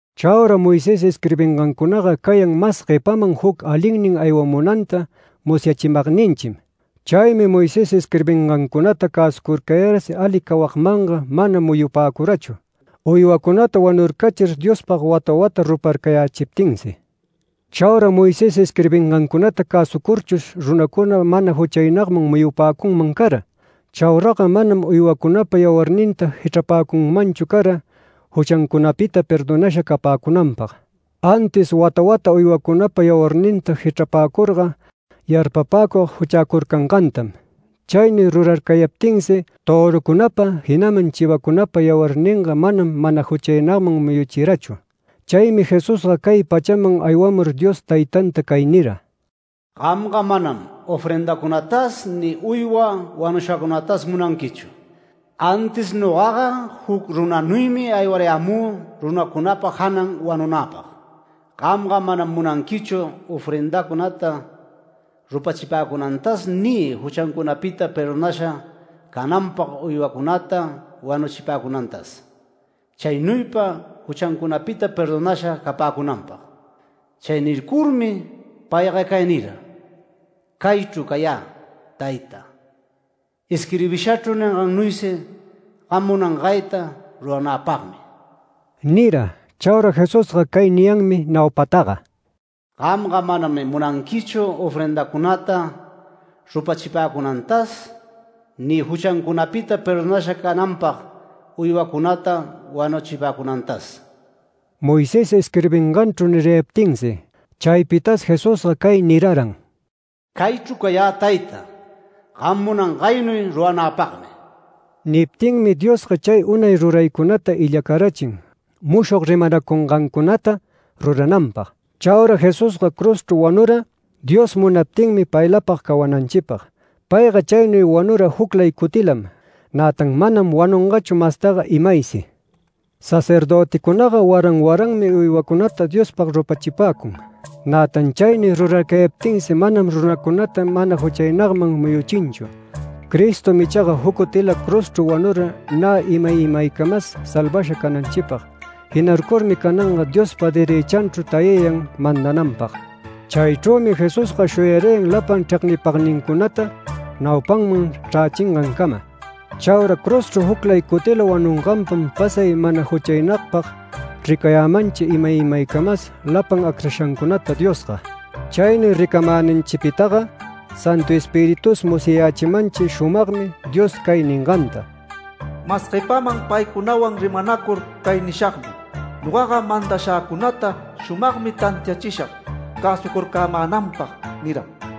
Chaura Moisés isquirbingancunaga cayan mas guepaman juc alinnin aywamunanta musyachimagninchim. Chaymi Moisés isquirbingancunata cäsucurcayarsi ali cawagmanga mana muyupäcurachu uywacunata wanurcachir Diospag wata wata ruparcayächiptinsi. Chaura Moisés isquirbingancunata cäsucurchush runacuna mana juchaynagman muyupäcunman cara. Chauraga manam uywacunapa yawarninta jichrapäcunmanchu cara juchancunapita perdonasha capäcunanpag. Antis wata wata uywacunapa yawarninta jichrapäcurga yarpapäcug juchäcurcangantam. Chaynuy rurarcayaptinsi törucunapa, jinaman chivacunapa yawarninga manam mana juchaynagman muyuchirachu. Chaymi Jesusga cay pachaman aywamur Dios Taytanta cay nira: “Gamga manam ofrendacunatas ni uywa wanushacunatas munanquichu. Antis nogaga juc runanuymi aywarayämü runacunapa janan wanunäpag. Gamga manam munanquichu ofrendacunata rupachipäcunantas, ni juchancunapita perdonasha cananpag uywacunata wanuchipäcunantas, chaynuypa juchancunapita perdonasha capäcunapag”. Chay nircurmi payga cay nira: “Caychru cayä Tayta, isquirbishachru ningannuysi gam munangayta ruranäpagmi” nira. Chaura Jesusga cay niyanmi naupataga: “Gamga manam munanquichu ofrendacunata rupachipäcunantas, ni juchancunapita perdonasha cananpag uywacunata wanuchipäcunantas” Moisés isquirbinganchru nirayaptinsi. Chaypitas Jesusga cay niraran: “Caychru cayä Tayta, gam munangaynuy ruranäpagmi”. Niptinmi Diosga chay unay ruraycunata illacarachin mushog rimanacungancunata rurananpag. Chaura Jesusga cruzchru wanura Dios munaptinmi paylapag cawananchipag. Payga chaynuy wanura juclay cutilam, nätan manam wanungachu mastaga imaysi. Sacerdöticunaga waran waranmi uywacunata Diospag rupachipäcun, nätan chaynuy rurarcayaptinsi manam runacunata mana juchaynagman muyuchinchu. Cristom ichaga juc cutila cruzchru wanura nä imay imaycamas salvasha cananchipag. Jinarcurmi cananga Diospa derëchanchru tayayan mandananpag. Chaychrümi Jesusga shuyarayan lapan chregnipagnincunata naupanman chrächingancama. Chaura cruzchru juclay cutila wanunganpam pasay mana juchaynagpag ricayämanchi imay imaycamas lapan acrashancunata Diosga. Chaynuy ricamänanchipitaga Santu Espiritus musyayächimanchi shumagmi Dios cay ninganta: “Mas guepanman paycunawan rimanacur cay nishagmi ‘Nogaga mandashäcunata shumagmi tantiachishag cäsucarcämänanpag’ niram.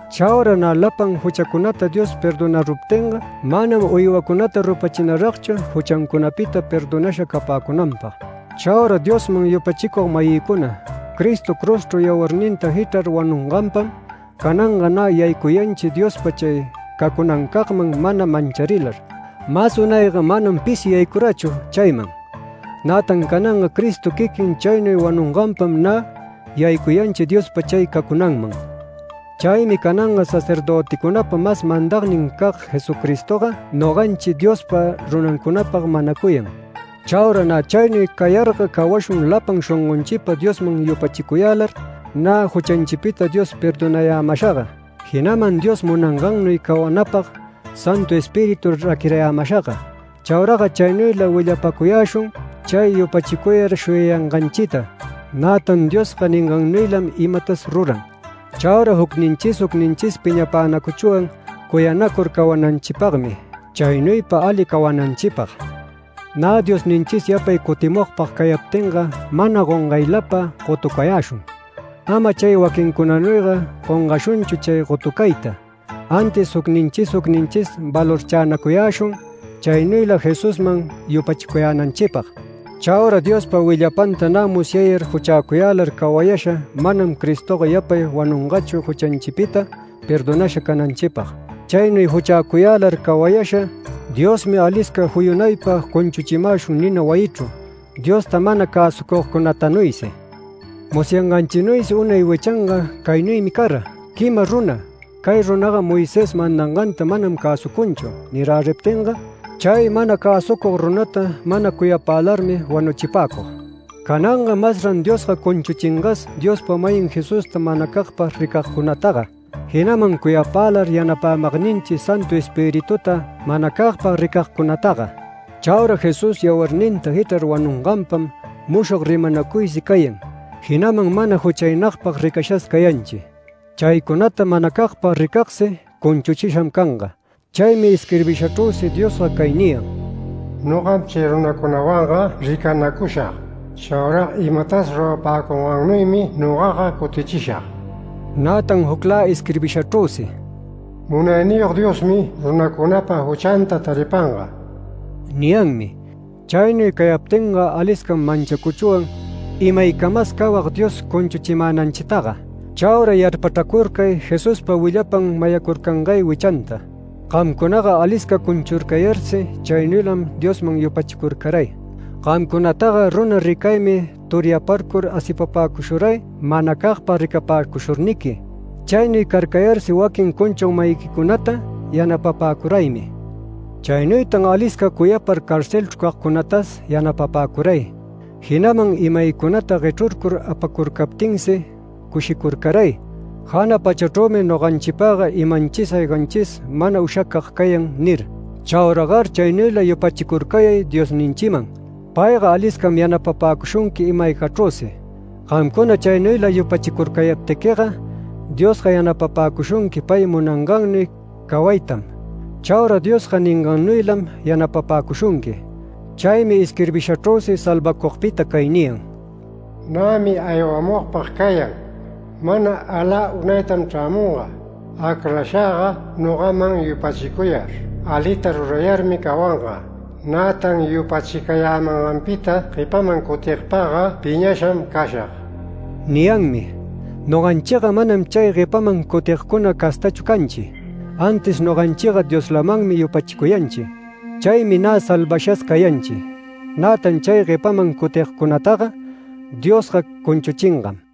Chaura nä lapan juchacunata Dios perdonaruptinga manam uywacunata rupachinaragchu juchancunapita perdonasha capäcunanpag. Chaura Diosman yupachicug-mayïcuna, Cristo cruzchru yawarninta jichrar wanunganpam cananga nä yaycuyanchi Diospa chay cacunancagman mana mancharilar. Mas unayga manam pisi yaycurachu chayman, nätan cananga Cristo quiquin chaynuy wanunganpam nä yaycuyanchi Diospa chay cacunanman. Chaymi cananga sacerdöticunapa mas mandagnincag Jesucristoga noganchi Diospa runancunapag manacuyan. Chaura nä chaynuy cayarga cawashun lapan shongonchipa Diosman yupachicuyälar, nä juchanchipita Dios perdonarayämashaga, jinaman Dios munangannuy cawanapag Santu Espíritu raquirayämashaga. Chauraga chaynuyla willapacuyäshun chay yupachicuyar shuyacuyanganchita, nätan Diosga ningannuylam imatas ruran. Chaura jucninchis jucninchis piñapänacuchwan cuyanacur cawananchipagmi chaynuypa ali cawananchipag. Nä Diosninchis yapay cutimugpag cayaptinga mana gongaylapa gotucayäshun. Ama chay waquincunanuyga gongashunchu chay gotucayta, antis jucninchis jucninchis valorchänacuyäshun chaynuyla Jesusman yupachicuyänanchipag. Chaura Diospa willapanta nä musyayar juchäcuyälar cawayasha manam Cristoga yapay wanungachu juchanchipita perdonasha cananchipag. Chaynuy juchäcuyälar cawayasha Diosmi alisca juyunaypa cunchuchimäshun nina wayichru, Diosta mana cäsucugcunatanuysi. Musyanganchinuysi unay wichanga caynuymi cara: Quima runa “Cay runaga Moisés mandanganta manam cäsucunchu” niräriptinga, chay mana cäsucug runata mana cuyapälarmi wanuchipäcug. Cananga masran Diosga cunchuchingas Diospa-mayin Jesusta manacagpag ricagcunataga, jinaman cuyapälar yanapämagninchi Santu Espirituta manacagpag ricagcunataga. Chaura Jesús yawarninta jichrar wanunganpam mushog rimanacuysi cayan, jinaman mana juchaynagpag ricashas cayanchi. Chaycunata manacagpag ricagsi cunchuchisham canga. Chaymi isquirbishachrüsi Diosga cay niyan: “Nogam chay runacunawanga ricanacushag. Chaura imatas rurapäcungannuymi nogaga cutichishag”. Nätan juclä isquirbishachrüsi “Munayniyog Diosmi runancunapa juchanta taripanga” niyanmi. Chaynuy cayaptinga aliscam manchacuchwan imaycamas cawag Dios cunchuchimänanchitaga Chaura yarpachracurcay Jesuspa willapan mayacurcangay wichanta. Gamcunaga alisca cunchurcayarsi chaynuylam Diosman yupachicurcaray. Gamcunataga runa ricaymi turyaparcur asipapäcushuray manacagpag ricapäcushurniqui. Chaynuy carcayarsi waquin cunchug-mayiquicunata yanapapäcuraymi. Chaynuytan alisca cuyapar carcelchru cagcunatas yanapapäcuray, jinaman imaycunata guechrurcur apacurcaptinsi cushicurcaray “Jana pachachrümi noganchipagga imanchis ayganchis mana ushacag cayan” nir. Chauragar chaynuyla yupachicurcayay Diosninchiman. Payga aliscam yanapapäcushunqui ima-aygachrüsi. Gamcuna chaynuyla yupachicurcayaptiquiga Diosga yanapapäcushunqui pay munangannuy cawaytam. Chaura Diosga ningannuylam yanapapäcushunqui. Chaymi isquirbishachrüsi salvacugpita cay niyan: “Nämi aywamugpag cayan. Mana alä unaytam chrämunga. Acrashäga nogaman yupachicuyar alita rurayarmi cawanga. Nätan yupachicayämanganpita guepaman cutigpagga piñasham cashag” niyanmi. Noganchiga manam chay guepaman cutigcuna castachu canchi, antis noganchiga Dioslamanmi yupachicuyanchi. Chaymi nä salvashas cayanchi. Nätan chay guepaman cutigcunataga Diosga cunchuchingam.